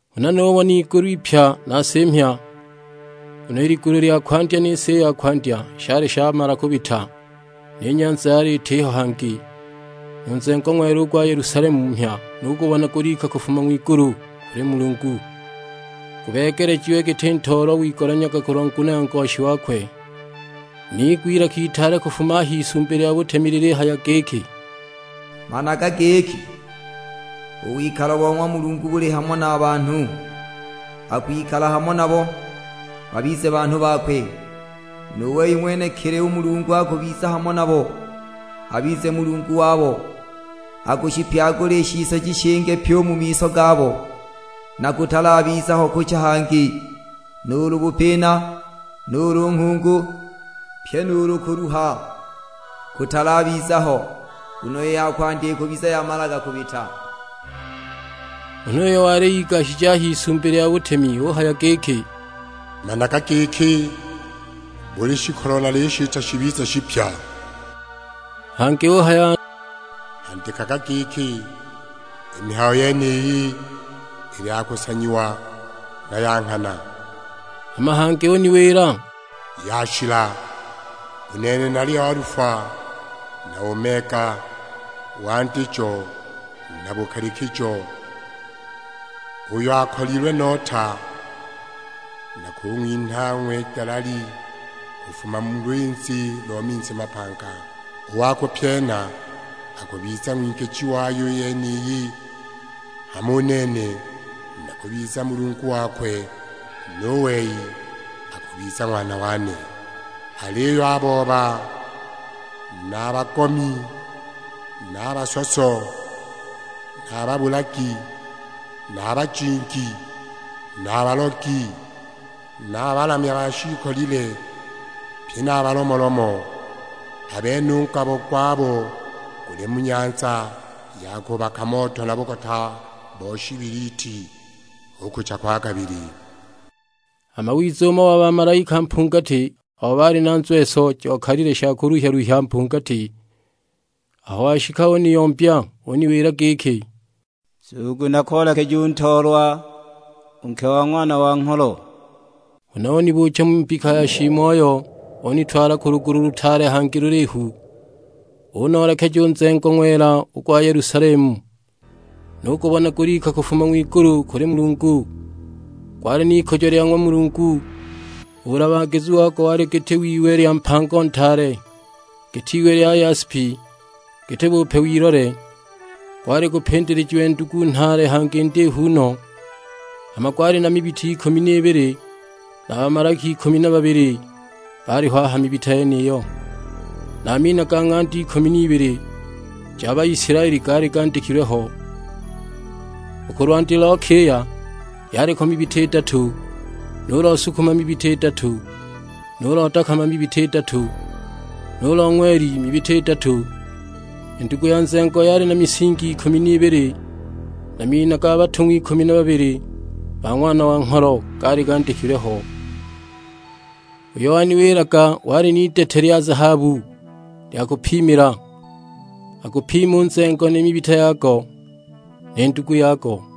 Huna nubona igulu ipya na si mhya; nguno i ligulu lya kwandya ni si i ya kwandya shali shamala kubita, ni nyanza yali itiho hangi. Nu nzengo ng'wela u gwa Yelusalemu mhya nugubona gulika kufuma ng'wigulu kuli Mulungu, gubeegelejiwe giti ntoolwa wigolanyaga kulwa nguno ya ngoshi wakwe. Niigwa ilaka itaale kufuma a h'Isumbi lya butemi lilihaya giki, "Managa giki, u wikalo bo ng'wa Mulungu buli hamo na banhu, akwikala hamo nabo, babize banhu bakwe; nu wei ng'wenekili u Mulungu akubiza hamo nabo, abize Mulungu wabo. Akushipyagula i shisoji shinge pyi u mu miso gabo, na kutalabiza ho kucha hangi, nuulu bupina, nuulu nghungu; pye nuulu kuluha kutalabiza ho, nguno i ya kwandya ikubiza yamalaga kubita." Huna uyo wali igashije a h'Isumbi lya butemi uhaya giki, "Managa giki, buli shikolo nalishita shibize shipya!" Hangi uhaya, "Andikaga giki, 'I mihayo yeniyi ili ya kusanyiwa, na ya nghana.' " Hama hangi uniwila, "Yashila! U nene nali Alufa na Omega, Wandijo na Bukalikijo; uyo akolilwe nota nakung'winha ang'we dalali kufuma mu lwinzi lo minzi mapanga. U wa kupyena akubiza ng'wingiji wayo i yeniyi, hama u nene nakubiza Mulungu wakwe, nu wei akubiza ng'wana wane. Aliyo a booba na a bagomi, na a basoso, na a babulagi, na a bajingi, na a balogi, na a balamya ba shiikolile; pye na a balomolomo, a bene u ngabo gwabo guli mu nyanza ya kubaka moto na bugota bo shibiliti, hu kucha kwa kabili." Hama wiza umo wa bamalaika mpungati abo baali na nzweso jokalile sha kuluhya-luhya mpungati. Aho washika uniyombya; uniwila giki, "Nzugu nakoolekeje u Ntoolwa, u nke wa Ng'wana wa Ngholo." Huna unibuucha mu mbika ya shiimoyo, unitwala ku lugulu lutaale hangi lulihu, unoolekeja u nzengo ng'wela u gwa Yelusalemu, nugubona gulika kufuma ng'wigulu kuli Mulungu. Gwali n'ikujo lya ng'wa Mulungu, u bulabagizu wago wali giti w'iwe lya mpango ntaale, giti iwe lya yaspi, giti bupe w'ilole. Gwali gupindilijiwe ndugu nhaale hangi ndihu no; hama gwali na mibita ikumi n'ibili na bamalaika ikumi na babili baaliho a ha mibita yeniyo, na a mina ga ng'anda ikumi n'ibili ja Baisilaeli gaali gandikilwe ho. U ku lwandi lo kiya yaliko mibita idatu, nu lo sukuma mibita idatu, nu lo dakama mibita idatu, nu lo ng'weli mibita idatu. I ndugu ya nzengo yali na misingi ikumi n'ibili; na a mina ga batung'wa ikumi na babili ba Ng'wana wa Ngholo gaali gandikilwe ho. Uyo waniwilaga wali n'idete lya zahabu lya kupimila, agupime u nzengo ni mibita yago, ni ndugu yago.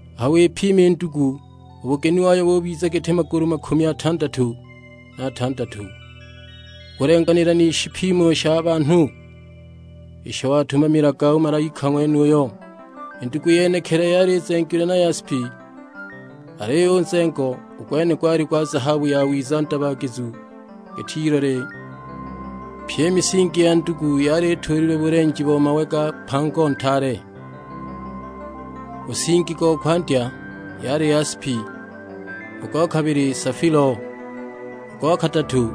Aho wipima i ndugu u buginu wayo bubiza giti magulu makumi atandatu na atandatu, u kulenganila ni shipimo sha banhu, isho watumamilaga u malaika ng'wenuyo. I ndugu yenekili yali izengilwe na yaspi, aliyo u nzengo, u gwene gwali gwa zahabu yawiza ndabagizu giti ilole. Pye i misingi ya ndugu yali ituulililwe bulenji bo mawe ga mpango ntaale, u nsingi go kwandya yali yaspi, u go kabili safilo, u go kadatu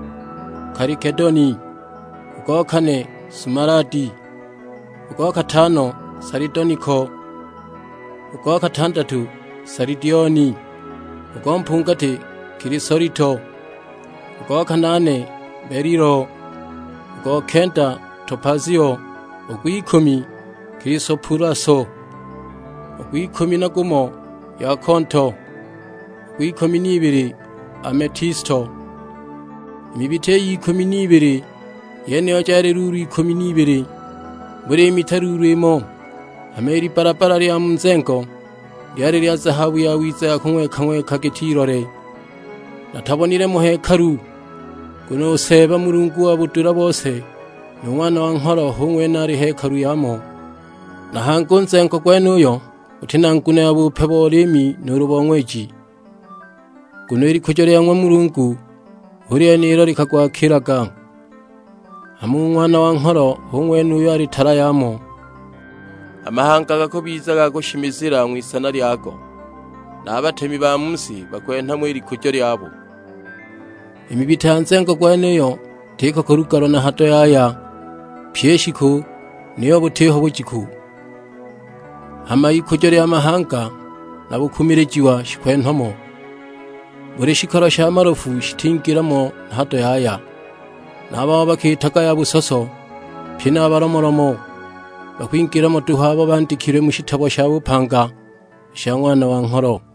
kalikedoni, u go kane sumaladi. U go katano salidoniko, u go katandatu salidioni, u go mpungati kilisolito, u go kanaane belilo, u go kenda topazio, u gw'ikumi kilisopulaso, u gw'ikumi na gumo yakonto, u gw'ikumi n'ibili ametisto. I mibita iy'ikumi n'ibili yeniyo jali luulu ikumi n'ibili; buli mita luulu imo, hama i libbalabbala lya mu nzengo lyali lya zahabu yawiza ya kung'weka-ng'weka giti ilole. Natabonile mo hekalu, nguno u Seeba Mulungu wa budula bose, nu Ng'wana wa Ngholo hu ng'wene ali hekalu yamo. Na hangi u nzengo gwenuyo guti na nguno ya bupe bo liimi nuulu bo ng'weji, nguno i likujo lya ng'wa Mulungu hu lyene ilo likagwakiilaga, hama u Ng'wana wa Ngholo hu ng'wene uyo ali tala yamo. A mahanga gakubiza ga kushimizila ng'wisana lyago; na a batemi ba mu si bakwenha mo i likujo lyabo. I mibita ya nzengo gwenuyo itiko kulugalwa na hado yaya pyi i shiku, niyo butiho bujiku. Hama ikujo lya mahanga na bukumilija shikwenhwa mo. Buli shikolo sha malofu shitingila mo na hado yaya, na a babo bakiitaga ya busoso, pye na a balomolomo. Bakwingila mo duhu abo bandikilwe mu shitabo sha bupanga i sha Ng'wana wa Ngholo.